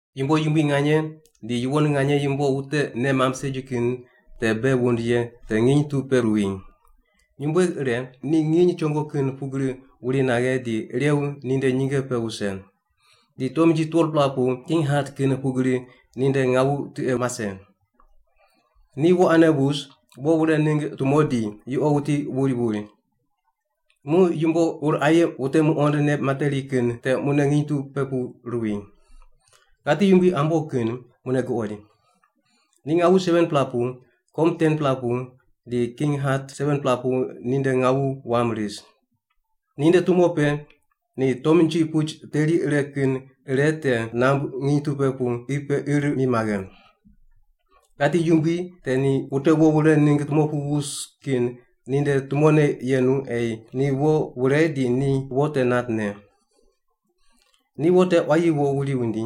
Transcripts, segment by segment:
Yumbo yumbui nganye di yuwon nganye yumbo wute nei mamb segi kin te bei wund ye te nginy tu pe ruwi. Nyumbueg ire, ni nginy chongo kin pugri wuri naghe di irew ninde nyinge pe wuse. Di tomnji 12-pela pu king hat kin pugri ninde ngawu tiqe mase. Ni wo ane wus, wo wure ningg tumo di yuqo wuti wuri wuri. Muq yumbo ur aye wute muqond nei materi kin te mune nginy tu pe ruwi. Ghati yumbui ambo kin mune guqoid. Ni ngawu 7-pela pu, kom 10-pela pu, di king hat 7-pela pu ninde ngawu wam ris. Ninde tumo pe ni tomnji puch teri ire kin ire te nambui nginy tu pe pu qi pe ir mi maghe. Ghati yumbui te ni wute wo wure ningg tumo pu wus kin ninde tumone yenu ei ni wo wure di ni wo te nat ne. Ni wo te quayi wo wuri wundi,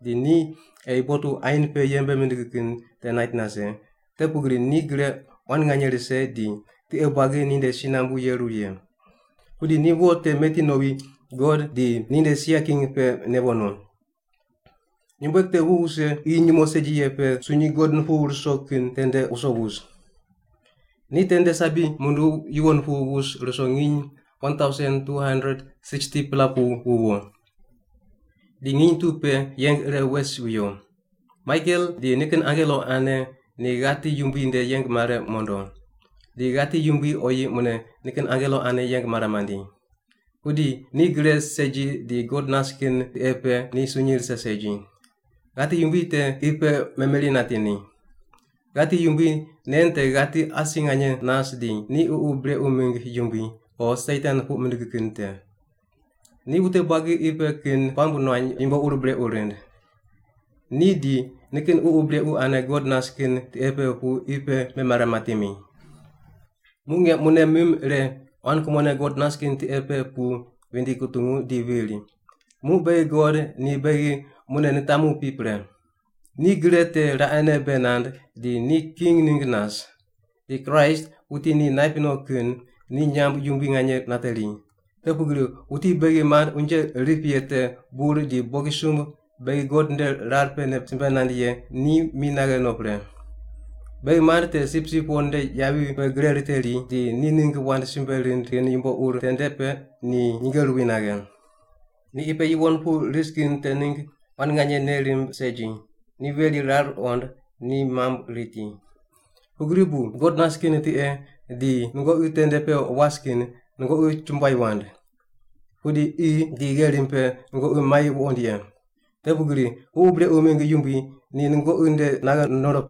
di ni ei botu ain pe yembe mindig kin te nait nase, te pugri ni gre quan nganye rise di tiqe buagi ninde si nambu yeru ye. Pudi ni wo te meti nowi God di ninde sia king pe newo no. Nyumbueg te wu wuse qi nyumo segi ye pe sunyi God nupuw ruso kin tende wuso wus. Ni tende sabi munduw yuwon pu wus ruso nginy 1,260-pela pu wuwo. Di nginy tu pe yeng ire wes wuyo. Maikel di nikin angelo ane ni ghati yumbui nde yeng mare mondo. Di ghati yumbui oyi mune nikin angelo ane yeng mare mandi. Pudi ni gre segi di God nas kin tiqe pe ni sunyi rise segi. Ghati yumbui te qi pe memeri nati ni. Ghati yumbui nen te ghati asi nganye nas di ni ququ brequ mingg yumbui o Satan puq mindig kin te. Ni wute buagi qi pe kin puamb nuany yumbo ur brequ rind. Ni di nikin ququ brequ ane God nas kin tiqe pe pu qi pe memare mati mi. Muq nge mune mim ire quan kumone God nas kin tiqe pe pu vindi kutungu di viri, “Muq beghi God ni beghi mune nitamu pi pre. Ni gre te raqene bei nand di ni king ningg nas. Di Kraist, wuti ni naip no kin, ni nyamb yumbui nganye nateri. Te pugri wuti beghi mand unje rip ye te bur di bogisumb beghi God nde rar pene simbe nand ye ni mi naghe no pre. Beghi mand te Sipsip Wo nde yavi pe gre riteri di ni ningg wand simbe rind kin yumbo ur tende pe ni nyinge ruwi naghe. Ni qi pe yuwon pu ris kin te ningg quan nganye nei rimb segi, ni veri rar ruqond ni mamb riti. Pugri bu God nas kin tiqe di nungoqi tende pe was kin nungoqi chumbuai wand! Pudi qi di gherim pe nungoqi mai wuqond ye. Te pugri ququ brequ mingg yumbui ni nungoqi nde naghe nondo.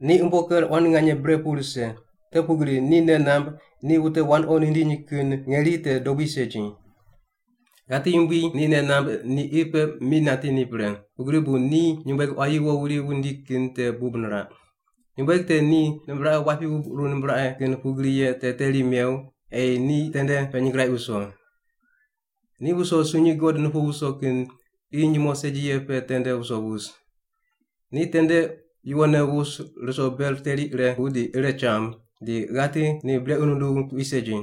Ni umbo ker quan nganye bre pu rise, te pugri ni nei namb ni wute wandoqi nindiny kin ngeri te dobui segi.” Ghati yumbui ni nei namb ni qi pe mi nati ni pre, pugri bu ni nyumbueg quayi wo wuri wundi kin te bub niraq. Nyumbueg te ni nimbraqe wapi wubquru nimbraqe kin pugri ye te teri mew ei ni tende pe nyingraiq wuso. Ni wuso sunyi God nupuw ruso kin qi nyumo segi ye pe tende wuso wus. Ni tende yuwonne wus ruso ber teri ire pu di ire cham, di ghati ni brequ nunduw tuqui segi.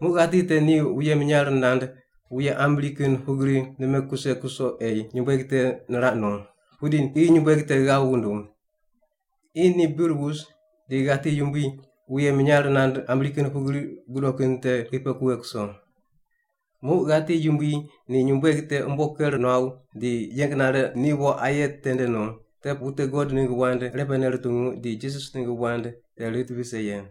Muq ghati te ni wuye minyar nand wuye ambri kin pugri nime kuse kuso ei nyumbueg te niraq no. Pudi qi nyumbueg te ghav wunduw. Qi ni bir wus di ghati yumbui wuye minyar nand ambri kin pugri gudo kin te qi pe kughe kuso. Muq ghati yumbui ni nyumbueg te umbo ker nuaw di yeng nare ni wo aye tende no, te wute God ningg wand irepene rutungu di Jisas ningg wand te rit vise ye.